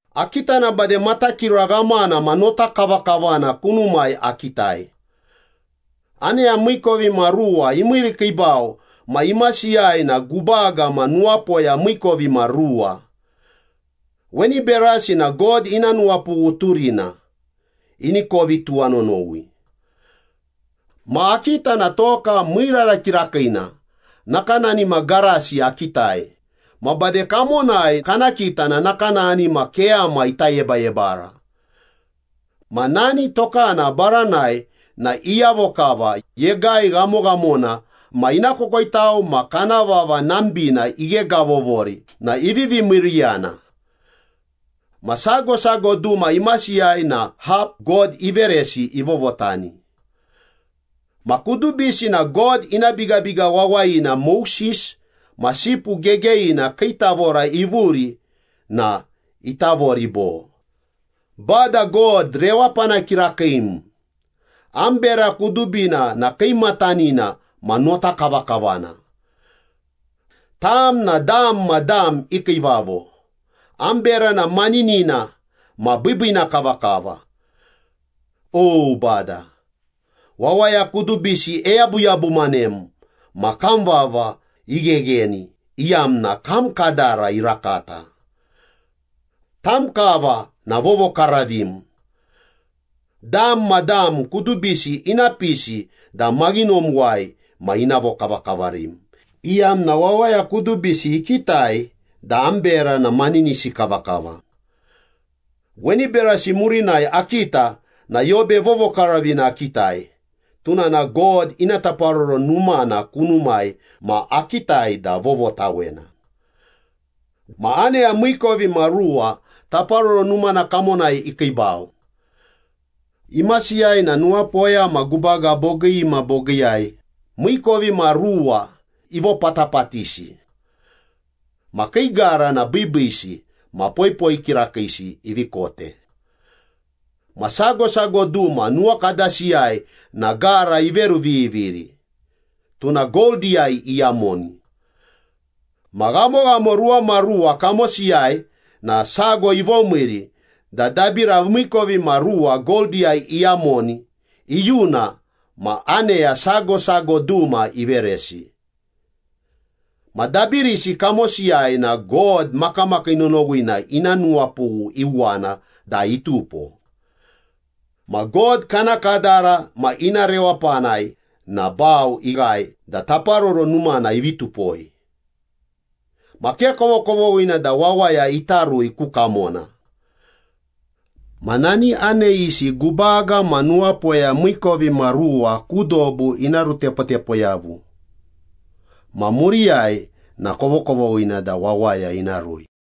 Akita na bade matakira ghamana ma notakavakavana kunumai akitai. Aneya miikovimaruwa imiirikiibau ma imasiyai na gubaga ma nuwapoya miikovimaruwa. Weni berasi na God ina nuwapughu turina, ini kovi tuwanonowi. Ma akita na toka miirara kirakiina nakanani ma garasi akitai, ma bade kamonai kana kita na nakanani ma keyama ita yebayebara. Ma nani tokana baranai na iyavo kava, yegai ghamoghamona ma ina kokoitau ma kana vava nambina ighegavovori na ivivi miiriyana. Ma sago sago duma imasiyai na hap God iveresi ivovotani. Ma kudubisi na God ina bigabiga wawayina Moses ma Sipu Gegeyina kii tavora ivuri na itavori bo, “Bada God rewapana kirakiim, am bera kudubina na kiimatanina ma notakavakavana. Tam na dam ma dam i kiivavo, am bera na maninina ma biibiina kavakava. O Bada, wawaya kudubisi eyabuyabumanem ma kam vava ighegheni iyamna kam kadara irakata. Tam kava na vovokaravim. Dam ma dam kudubisi ina pisi da maghinomuwai ma ina vokavakavarim, iyamna wawaya kudubisi ikitai da am bera na maninisi kavakava.” Weni berasi murinai akita na Yobe Vovokaravina akitai. Tuna na God ina taparoro numana kunumai ma akitai da vovotawena. Ma aneya miikovimaruwa taparoro numana kamonai ikiibau. Imasiyai na nuwapoya ma gubaga bogii ma bogiiyai miikovimaruwa ivopatapatisi. Ma kii gara na biibiisi ma poipoi kirakiisi ivi kote. Ma sago sago duma nuwakadasiyai na gara iveruviviri, tuna goldiyai iyamoni. Ma ghamoghamo ruwamaruwa kamosiyai na sago ivomiiri da dabira miikovimaruwa goldiyai iyamoni iyuna ma aneya sago sago duma iveresi. Ma dabirisi kamosiyai na God makamakii nonowina ina nuwapughu iuwana da itupo. Ma God kana kadara ma ina rewapanai na bau ighae da taparoro numana ivi tupoi. Ma ke kovokovoghina da wawaya ita rui ku kamona. Ma nani aneyisi gubaga ma nuwapoya miikovimaruwa ku dobu ina rutepotepo yavu ma muriyai na kovokovoghina da wawaya ina rui.